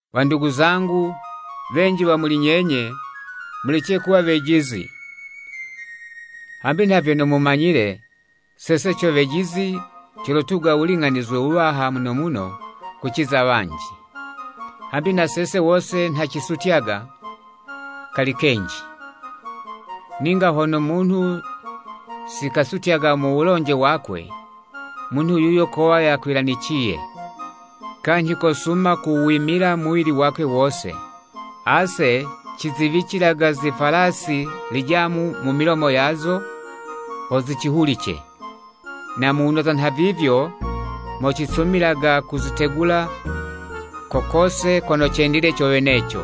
Wandugu zangu, wenji wa muli nyenye, mulece kuwa wejizi. Hambi nha vyono mumanyile, sese co wejizi colotuga wuling'anizwe wuwaha muno muno kuciza wanji. Hambi na sese wose nha cisutyaga kali kenji. Ninga hone munhu sikasutyaga mu wulonje wakwe, munhu yuyo kowa yakwilaniciye, kanyhi kosuma kuwimila muwili wakwe wose. Ase ciziwicilaga zifwalasi lijamu mu milomo yazo ho zicihulice, na muwunoza nhavivyo mo cisumilaga kuzitegula ko kose kono cendile co weneco. |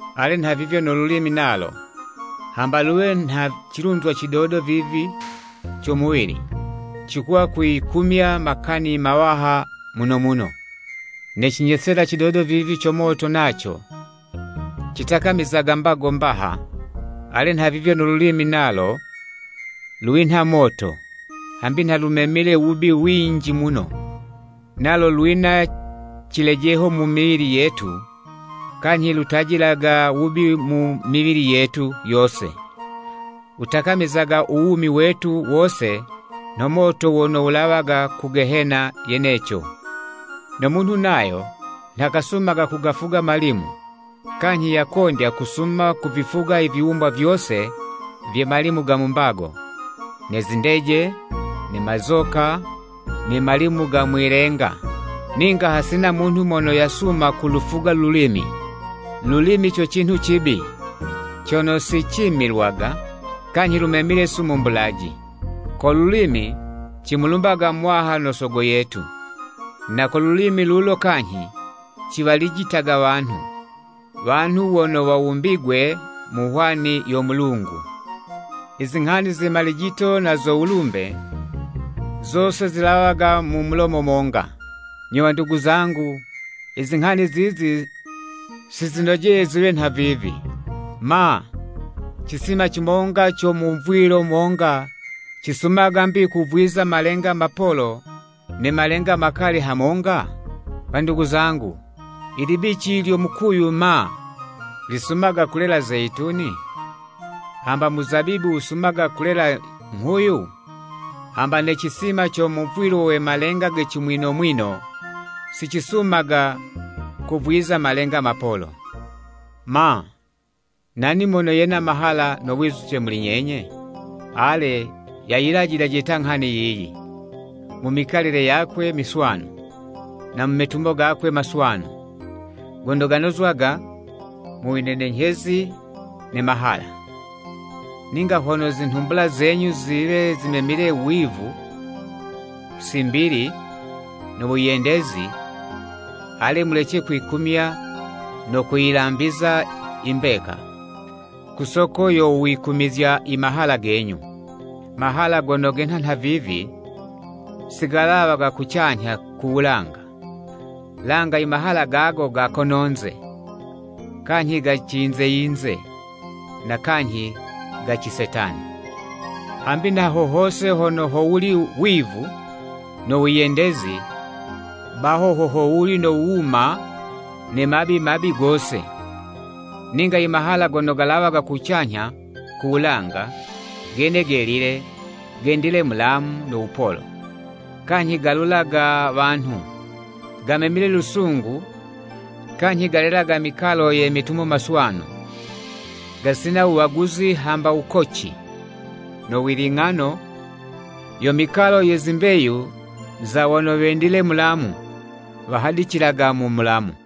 Ale nhavivyo no lulimi nalo, hamba luwe nha cilunzwa cidodo vivi co muwili, cikuwa kwiyikumya makani mawaha muno muno. Ne cinyesela cidodo vivi co moto naco citakamizaga mbago mbaha. Ale nhavivyo no lulimi nalo, lwinha moto. Hambi nha lumemile wubi winji muno, nalo lwina cilejeho mu miwili yetu, kanyhi lutajilaga wubi mu miwili yetu yose. Wutakamizaga u wumi wetu wose nho moto wono wulawaga ku Gehena yeneco. No munhu nayo, nha kasumaga kugafuga malimu, kanyhi yakondya kusuma kuvifuga i viwumbwa vyose vye malimu ga mu mbago, ne zindeje, ne mazoka, ne malimu ga mwilenga. Ninga hasina munhu mono yasuma kulufuga lulimi. Lulimi co cinhu cibi, cono sicimilwaga, kanyhi lumemile sumu mbulaji. Ko lulimi, cimulumbaga Muwaha no Sogo yetu. Na ko lulimi lulo kanyhi, ciwalijitaga wanhu, wanhu wono wawumbigwe mu hwani yo Mulungu. Izinghani ze malijito na zo wulumbe, zose zilawaga mu mulomo monga. Nyo wandugu zangu, izinghani zizi sizinojeye ziwe nhavivi. Ma, cisima cimonga co muvwilo monga cisumaga 'mbi kuvwiza malenga mapolo ne malenga makali hamonga? Wandugu zangu, libici lyo mukuyu ma, lisumaga kulela zeyituni? Hamba muzabibu wusumaga kulela nghuyu? Hamba ne cisima co muvwilo we malenga ge cimwino mwino, sicisumaga kuvwiza malenga mapolo. Ma, nani mono yena mahala no wizuce muli nyenye? Ale, yayilajilaje ta inghani yiyi, mu mikalile yakwe miswanu, na mu metumo gakwe maswanu, gono ganozwaga mu winenenyhezi ne mahala. Ninga hono zinhumbula zenyu ziwe zimemile wivu, simbili no wiyendezi, ale, mulece kwikumya no kuyilambiza i mbeka, ku soko yo wikumizya i mahala genyu. Mahala gono genha nhavivi, sigalawaga kucanyha ku wulanga, langa imahala gago ga kononze, kanyhi ga ciyinze yinze, na kanyhi ga cisetani. Hambi nha ho hose hono howuli wivu no wiyendezi, baho ho howuli no wuma ne mabi mabi gose. Ninga imahala gono galawaga kucanyha ku wulanga, gene gelile, gendile mulamu no wupolo, kanyhi galulaga wanhu, gamemile lusungu kanyhi galelaga mikalo ye metumo maswanu, gasina wuwaguzi hamba wukoci. No wiling'ano, yo mikalo ye zimbeyu za wono wendile mulamu wahadicilaga mu mulamu.